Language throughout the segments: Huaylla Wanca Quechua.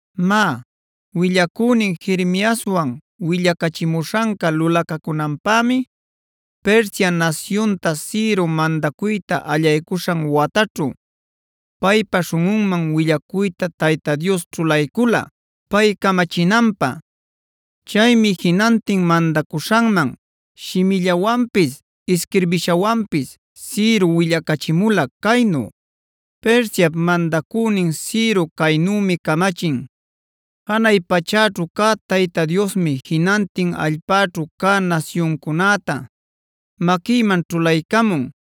Má, willacünin Jeremiaswan willacachimuśhanca lulacacunanpämia Persia nasyunta Ciro mandacuyta allaycuśhan wataćhu, paypa śhunꞌunman willacuyta Tayta Dios ćhulaycula pay camachinanpä. Chaymi jinantin mandacuśhanman shimillawanpis isquirbishawanpis Ciro willacachimula caynu: Persiap mandacünin Ciro caynümi camachin: “Janay pachäćhu cä Tayta Diosmi jinantin allpäćhu cä nasyuncunäta maquïman ćhulaycamun.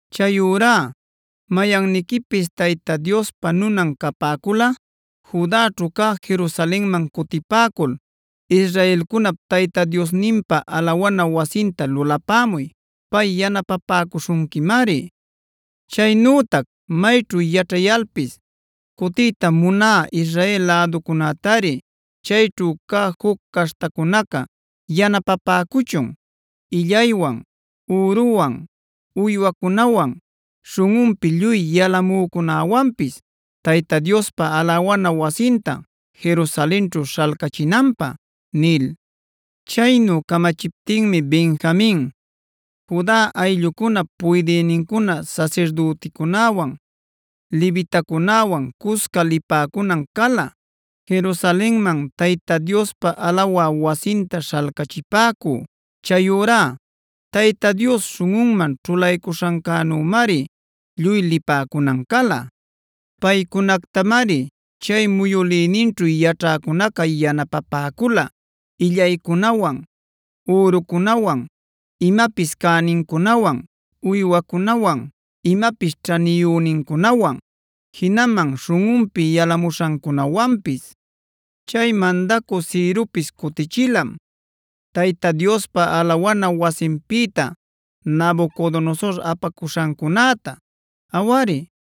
Chayurá mayanniquipis Tayta Diospa nunan capäculꞌa Judaćhu cä Jerusalenman cutipäcul israelcunap Tayta Diosninpa alawana wasinta lulapämuy; pay yanapapäcuśhunquimari. Chaynütac mayćhu yaćhayalpis cutiyta munä Israel läducunätari chayćhu cä juc caśhtacunaca yanapapäcuchun illaywan, üruwan, uywacunawan, śhunꞌunpi lluy yalamücunäwanpis Tayta Diospa alawana wasinta Jerusalenćhu śhalcachinanpä” nil. Chaynu camachiptinmi Benjamin, Juda ayllucunap puydïnincuna sasirdüticunäwan levitacunäwan cusca lipäcunan cala Jerusalenman Tayta Diospa alawa wasinta śhalcachipäcü. Chayurá Tayta Dios śhunꞌunman ćhulaycuśhancunämari lluy lipäcunan cala. Paycunactamari chay muyülininćhu yaćhäcunaca yanapapäcula: illaycunawan, ürucunawan, imapis cänincunawan, uywacunawan, imapis ćhaniyünincunawan, jinaman śhunꞌunpi yalamuśhancunawanpis. Chay mandacü Ciropis cutichilam Tayta Diospa alawana wasinpïta Nabucodonosor apacuśhancunäta. Awari,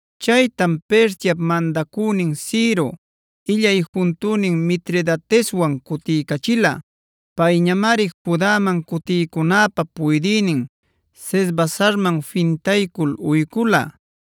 Chaytam Persiap mandacünin Ciro illay juntünin Mitridateswan cutiycachila. Payñamari Judaman cutïcunäpä puydïnin Sesbasarman fintaycul uycula.